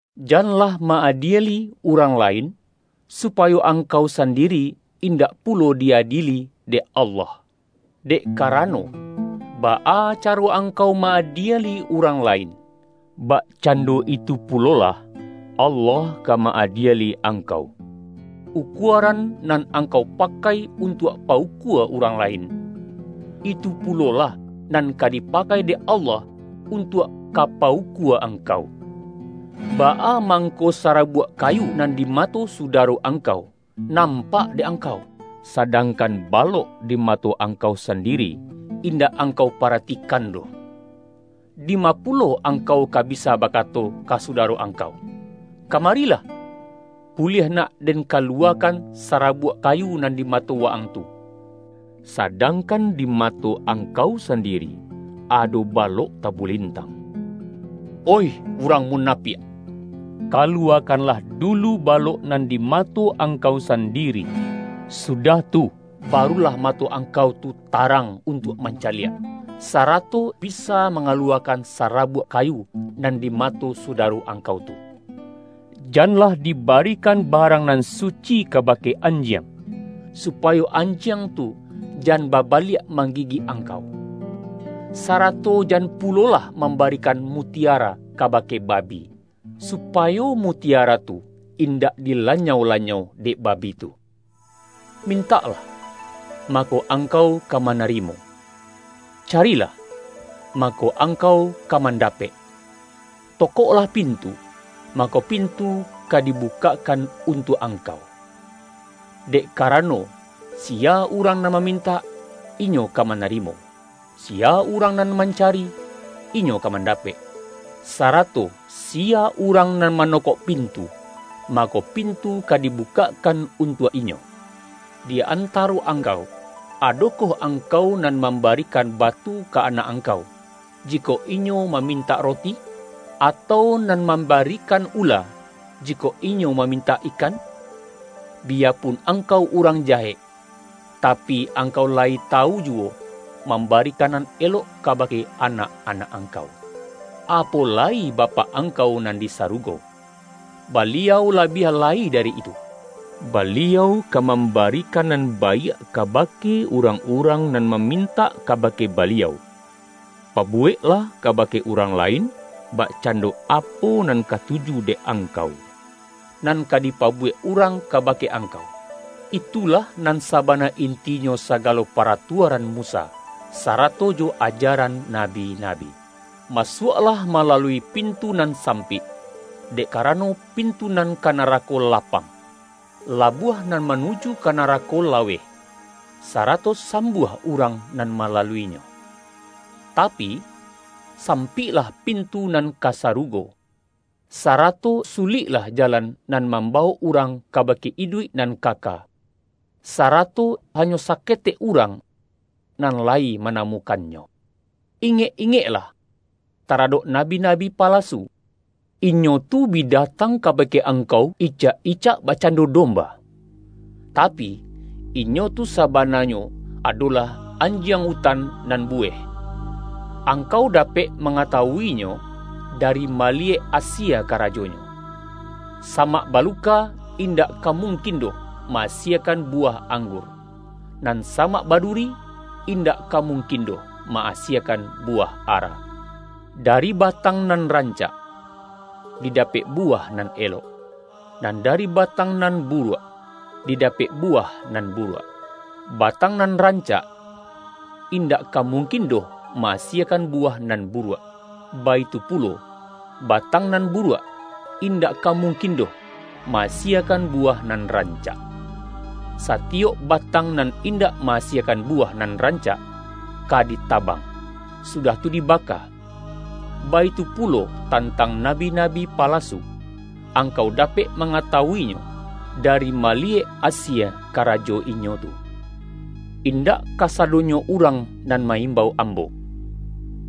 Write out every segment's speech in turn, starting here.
”Janlah ma-adieli urang lain, supayo angkau sandiri indak pulo di-adieli dek Allah. Dek karano, baa caro angkau ma-adieli urang lain, bak-cando itu pulolah, Allah ka ma-adie-li angkau. Ukuaran nan angkau pakai untuak pa-ukua urang lain, itu pulo-lah nan ka dipakai dek Allah untuak ka pa-ukua angkau. Baa mangko sa-rabuak kayu nan di mato sudaro ang-kau, nampak dek angkau? Sadangkan balok di mato angkau sandiri indak angkau paratikan doh! Dima pulo angkau ka bisa bakato ka sudaro ang-kau, ’Kamarilah, buliah nak den ka-luwakan sarabuak kayu nan di mato wa-ang tu.’ sadangkan di mato angkau sandiri ado balok tabulintang? Oih urang munapiak! Kaluwakanlah du-lu balok nan di mato angkau sandi-ri, sudah tu barulah mato angkau tu tarang untuak mancaliak, sarato bi-sa mangaluwakan sarabuak kayu nan di mato sudaro angkau tu. Janlah dibarikan barang nan su-ci kabake anjiang, supayo anjiang tu jan babaliak manggigik angkau. Sa-rato jan pulolah mambarikan mutiara kabake babi, supayo mutiara tu indak dilanyau-lanyau dek babi tu.” ”Mintaklah, mako angkau ka mana-rimo. Carilah, mako angkau ka man-dapek. Tokoklah pintu, mako pintu ka dibukakkan untuak angkau. Dek ka-rano, siya urang nan mamintak, inyo ka manarimo; siya urang nan mancari, inyo ka mandapek; sarato siya urang nan manokok pintu, mako, pintu ka dibukakkan untuak inyo. Di antaro angkau, adokoh angkau nan mamba-rikan batu ka anak angkau, jikok inyo mamintak roti? Atau nan mamba-rikan ula, jikok inyo mamintak ikan? Biyapun angkau urang jahek, tapi, angkau layi tawu juwo mambarikan nan elok kabake anak-anak angkau. Apo lai Bapak angkau nan di sarugo! Baliau labiah lai dari itu, Baliau ka mambarikan nan baiak kabake urang-urang nan mamintak kabake Baliau. Pabuweklah kabake urang lain, bakcando apo nan katuju dek angkau, nan ka dipabuwek urang kabake ang-kau. Itulah nan sabana intinyo saga-lo paratuaran Musa sarato jo ajaran nabi-nabi.” ”Masuaklah malalui pintu nan sampik, dek karano, pintu nan ka na-rako lapang, labuah nan manuju ka narako laweh, sarato sambuah urang nan malalu-inyo. Tapi, sampiklah pintu nan ka sarugo, sarato suliklah jalan nan mambawok urang kabake iduik nan kaka. Sarato hanyo saketek urang nan lai manamukannyo.” ”Ingek-ingeklah taradok nabi-na-bi palasu. Inyo tu bi datang kabake angkau icak-icak bakcando domba, ta-pi, inyo tu sabananyo, adolah anjiang utan nan buweh. Angkau dapek ma-ngatawuinyo, dari maliyek asie kara-jonyo. Samak baluka, indak ka mung-kin doh ma-asiekan buwah anggur, nan samak baduri, indak ka mungkin doh ma-asiekan buwah ara. Dari ba-tang nan rancak, didapek buwah nan elok, nan dari batang nan buruak, di-dapek buwah nan buruak. Batang nan rancak, indak ka mungkin doh ma-asiekan buwah nan buruak, baitu pulo, batang nan buruak, indak ka mungkin doh ma-asiekan buwah nan rancak. Satiyok batang nan indak ma-asiekan buwah nan rancak, ka di-tabang, sudah tu dibaka. Baitu pu-lo tantang nabi-nabi palasu. Angkau dapek mangatawuinyo, dari maliyek asie karajo inyo tu.” ”Indak kasadonyo urang nan ma-imbau Ambo,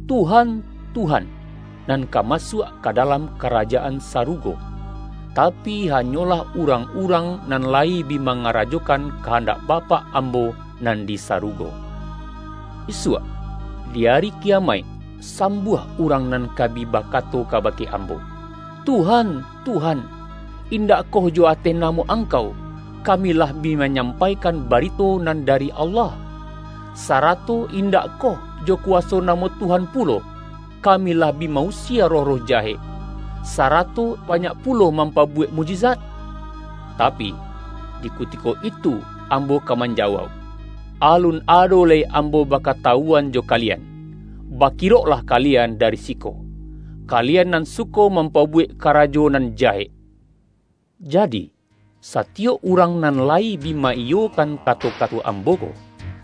’Tuhan, Tuhan.’ nan ka masuak dalam Karajaan Sarugo, ta-pi hanyolah urang-urang nan layi bi mangarajokan kahandak Bapak Am-bo nan di sarugo. Isuak di Ari Ki-yamaik, sambuah urang nan ka bi ba-kato kabake Ambo, ’Tuhan, Tuhan, indakkoh jo ateh namo Angkau, kami lah bi manyampaikan barito nan da-ri Allah? Sarato indakkoh, jo kuwaso namo Tuhan pulo, kami lah bi ma-usie roh-roh jahek, sarato banyak pu-lo mampabuwek mukjizat?' Tapi, di kutiko itu Ambo ka manjawauk, Alun ado lai Ambo bakatawuan jo kalian! Bakiroklah kalian dari siko, kalian nan suko mampabuwek kara-jo nan jahek!’” ”Jadi, satiyok urang nan layi bi ma-iyokan kato-kato Ambo ko,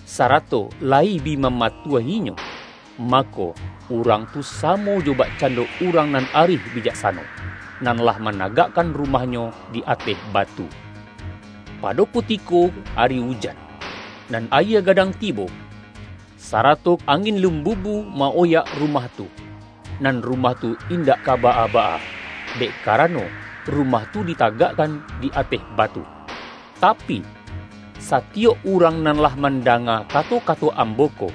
sarato layi bi mamatuahinyo, mako, urang tu samo jo bakcando urang nan arih bijaksano, nan lah managakkan ru-mahnyo di ateh batu. Pado kuti-ko ari ujan, nan ayie gadang tibo, sa-rato angin limbuhu ma-oyak rumah tu, nan rumah tu indak ka baa-baa, dek karano rumah tu ditagakkan di ateh batu. Tapi, satiyok urang nan lah man-danga kato-kato Ambo ko,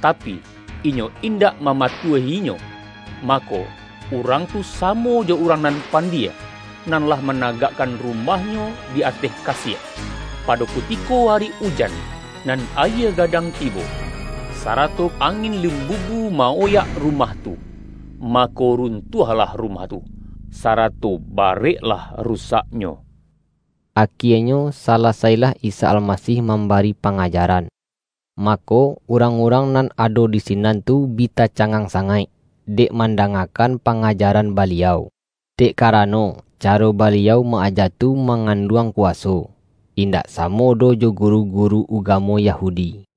tapi, inyo indak mamatuah-inyo, mako, urang tu samo jo urang nan pandie, nan lah managakkan rumahnyo di ateh kasiek. Pado kutiko ari ujan, nan ayie ga-dang tibo, sarato angin limbubu ma-oyak rumah tu, mako, runtuahlah ru-mah tu. Sarato bareklah rusaknyo!” Akienyo salasailah Isa Almasih mambari pangajaran, mako urang-urang nan ado di sinan tu bi tacangang sangaik, dek mandangakan pangajaran Baliau. Dek karano, caro Baliau ma-aja tu manganduang kuwaso, indak sa-mo doh jo guru-guru ugamo Yahudi.